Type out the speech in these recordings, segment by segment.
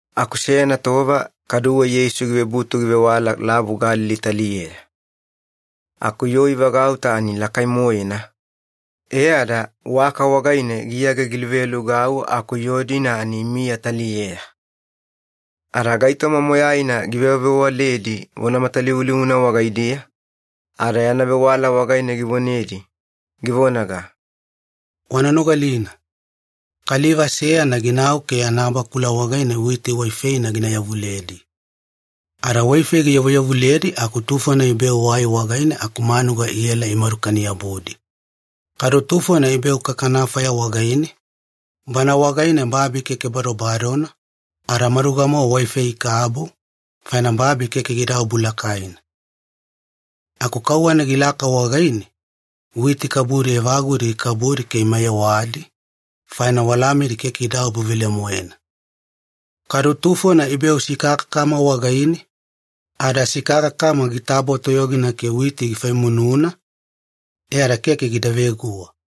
Aku seyana tova kaduwe Yeisu givebutu givewala Lavu Galili taliyeya. Aku yoo ivagauta ani lakai-moena, e ada waka wagaine giyage giluvealugau aku yoo-dina ani imiya taliyeya. Ada gaitoma moyaina givewavewaledi vona matalivulivuna wagaidiya, ada yana vewala wagaine givonedi, givonaga, “Wana nogalina. Kaliva seyana ginau ke yana bakula wagaine witi waifeina gina yavuledi. Ada waifei giyavuyavuledi aku tufona ibeu wai wagaine aku manuga iela imadukani-yabudi. Kadu tufona ibeu kakanafaya wagaine, bana wagaine babi keke badobadona, ada maduga-mowa waifei ikabu, faina babi keke gidaobu lakaina. Aku kauwana gilaka wagaine, witi kabudi evagudi gikabudi ke imayewadi, faina walamidi keke idaobu velemoena. Kadu tufona ibeu sikakakama wagaine, ada sikakakama gitabo toyogina ke witi gifaimununa, e ada keke gida veguwa.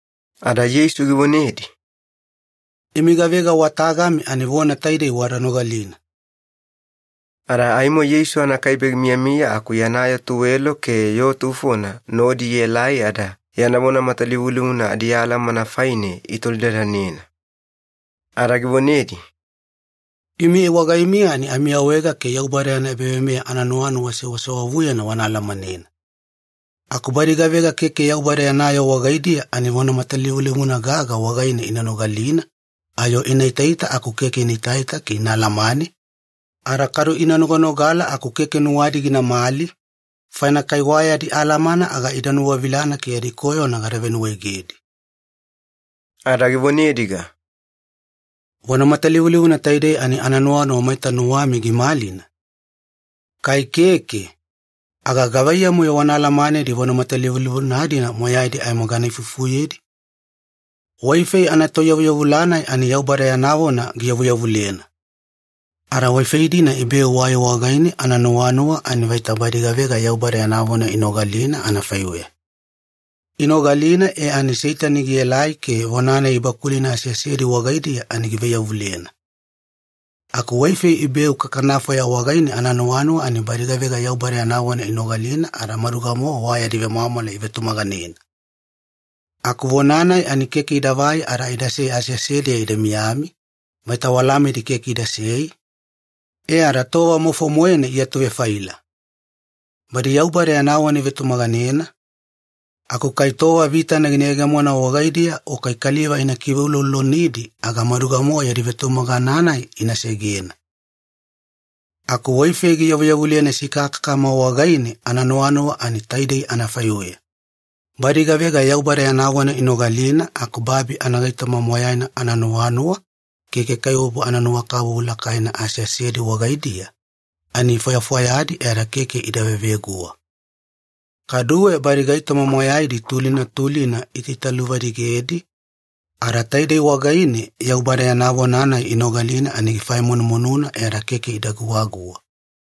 Ada Yeisu givonedi, “Imi gavega wa tagami ani vona taidei wada nogalina.” Ada aimo Yeisu anakaibe gimiyamiya aku yana yoo tuwelo ke yoo tufona nodi ielai ada yana vona matalivulivuna adialamana faine itolidadanena. Ada givonedi, “Imi wagaimiya ani amiawaega ke Yaubada yana ebaveimeya ananuwanuwa sewasewavuyena wana alamanena. Aku badi gavega keke Yaubada yana yoo wagaidiya ani vona matalivulivuna gaga wagaine ina nogalina ayo ina itaita aku keke inaita ke ina alamane, ada kadu ina noganogala aku keke nuwadi ginamali, faina kai wa yadi alamana aga ida nuwavilana ke yadi koyona gada venuwaegedi.” Ada givonediga, “Vona matalivulivuna taidei ani ananuwanuwa maita nuwami gimalina? Kai keke, aga gavaiyamu-yo wana alamanedi vona matalivulivuna-dina moyaidi aimo gana ifufuyedi? Waifei anatoiyavuyavula-nai ani Yaubada yana vona giyavuyavulena. Ada waifei-dina ibeu wai wagaine ananuwanuwa ani vaita badi gavega Yaubada yana vona inogalina anafaiweya. Inogalina e ani Seitani gielai ke vona-nai ibakulina aseasedi wagaidiya ani givaiyavulena. Aku waifei ibeu kakanafaya wagaine ananuwanuwa ani badi gavega Yaubada yana vona inogalina ada maduga-mowa wa yadi vemwamwala ivetumaganena. Aku vona-nai ani keke idavai ada idasei aseasediya ida miyami, vaita walamidi keke idasei, e ada tova maufo-moena iatuvefaila. Badi Yaubada yana vona ivetumaganena, aku kai tova vitana gina yegemona wagaidiya o kai kaliva ina kiveuloulolonidi aga maduga-mowa yadi vetumagana-nai ina segena. Aku waifei giyavuyavulena sikakakama wagaine ananuwanuwa ani taidei anafaiweya. Badi gavega Yaubada yana vona inogalina aku babi anagaitoma moyaina ananuwanuwa ke kaikaiwabu ananuwakabubu lakaina aseasedi wagaidiya, ani ifwayafwayadi e ada keke ida veveguwa. Kaduwe badi gaitoma moyaidi tulina tulina iitaitaluvadigedi, ada taidei wagaine Yaubada yana vona-nai inogalina ani gifaifaimununa e ada keke ida guwaguwa.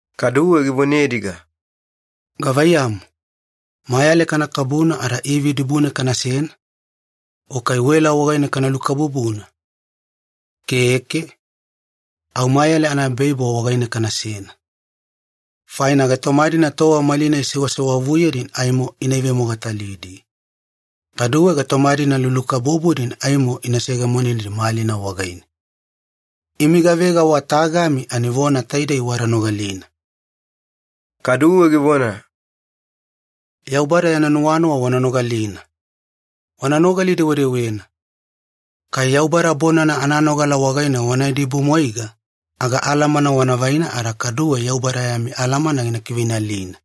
Kaduwe givonediga, “Gavaiyamu, mayale kana kabuna ada ivi dibune kanasena? O kai wela wagaine kana lukabubuna? Keke. Au mayale anaebaibo wagaine kanasena. Faina gaitoma-dina tova malinai sewasewavuyedi ani aimo ina ivemogatalidi, kaduwe gaitoma-dina lulukabubudi ani aimo ina seyegemonedi malina wagaine. Imi gavega wa tagami ani vona taidei wada nogalina.” Kaduwe givona, “Yaubada yana nuwanuwa wana nogalina. Wana nogali-dewedewena. Kai Yaubada bonana ananogala wagaine wana idibumwaiga, aga alamana wana vaina ada kaduwe Yaubada yami alamana gina kiveinalina.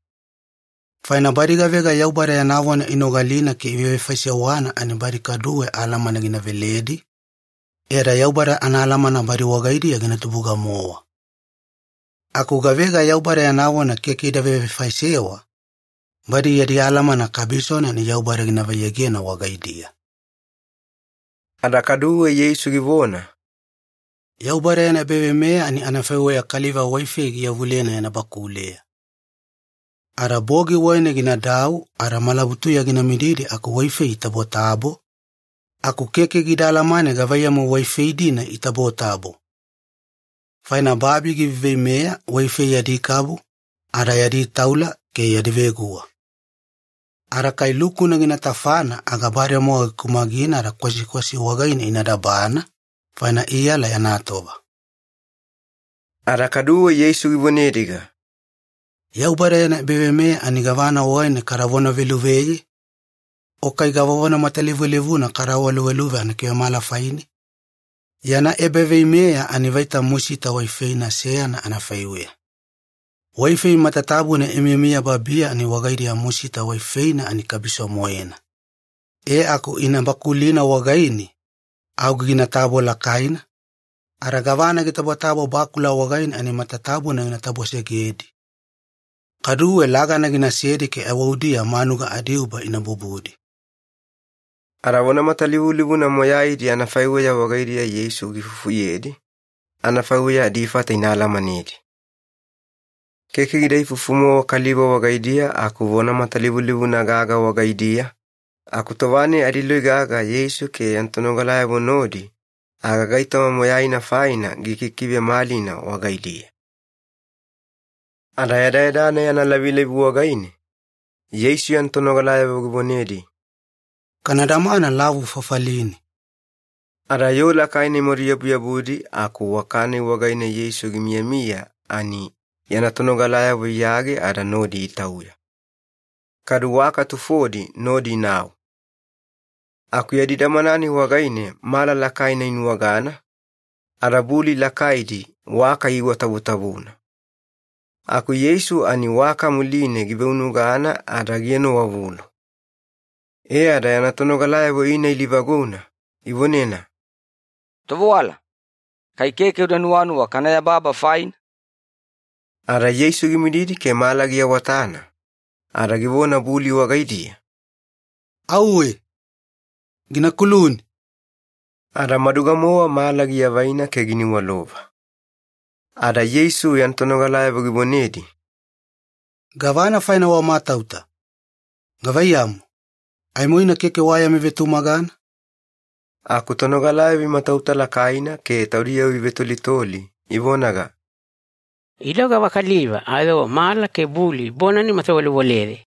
Faina badi gavega Yaubada yana vona inogalina ke ivevefaisewana ani badi kaduwe alamana gina veledi, e ada Yaubada anaalamana badi wagaidiya gina tubuga-mowa. Aku gavega Yaubada yana vona keke ida vevefaisewa, badi yadi alamana kabisona ani Yaubada gina vaiyegena wagaidiya.” Ada kaduwe Yeisu givona, “Yaubada yana ebaveimeya ani anafaiweya kaliva waifei giyavulena yana bakuleya. Ada bogi wagaine ginadau ada malabutuya gina mididi aku waifei itabotabo, aku keke gida alamane gavaiyamu waifei-dina itabotabo. Faina babi giveiveimeya waifei yadi kabu ada yadi taula ke yadi veguwa. Ada kai lukuna gina tafana aga bademowa gikumagina ada kwasikwasi wagaine ina dabana, faina iyala yana tova.” Ada kaduwe Yeisu givonediga, “Yaubada yana ebaveimeya ani gavana wagaine kada vonaveluveye? O kai gava vona matalivulivuna kada awaluveluve anakivemala faine? Yana ebaveimeya ani vaita musita waifeina seyana anafaiweya. Waifei matatabuna imiyamiya babiya ani wagaidiya musita waifeina ani kabiso-moena. E aku ina bakulina wagaine, au ginatabo lakaina, ada gavana gitabotabo bakula wagaine ani matatabuna gina tabosegedi. Kaduwe lagana ginasedi ke aiwaudiya manuga adiuba ina bubudi.” Ada vona matalivulivuna moyaidi anafaiweya wagaidiya Yeisu giifufuyedi, anafaiweya adifata ina alamanedi. Keke gida ifufu-mowa kaliva wagaidiya aku vona matalivulivuna gaga wagaidiya, aku tova-nai adiloi gaga Yeisu ke yana tonogalayavo nodi, aga gaitoma moyaina faina gikikivemalina wagaidiya. Ada yadayada-nai analavilavi wagaine, Yeisu yana tonogalayavo givonedi, “Kana damana lavu fafaline.” Ada yoo lakaina imadu yabuyabudi aku waka-nai wagaine Yeisu gimiyamiya ani yana tonogalayavo iyage ada nodi itauya. Kadu waka tufodi nodi inau. Aku yadi damana-nai wagaine mala lakaina inuwagana, ada buli lakaidi waka iiwatavutavuna. Aku Yeisu ani waka muline giveunugana ada gienowavulu. E ada yana tonogalayavo ina ilivaguna, ivonena, “Tovewala, kai keke uda nuwanuwa kana yababa faina?” Ada Yeisu gimididi ke mala giawatana, ada givona buli wagaidiya, “Auwe! Gina kuluni!” Ada maduga-mowa mala giavaina ke giniwalova. Ada Yeisu yana tonogalayavo givonedi, “Gavana faina wamatauta? Gavaiyamu, aimoina keke wa yami vetumagana?” Aku tonogalayavo imatauta lakaina ke taudiyavo ivetolitoli, ivonaga, “Ida gavakaliva ayo mala ke buli bonana imatawalewaleye!”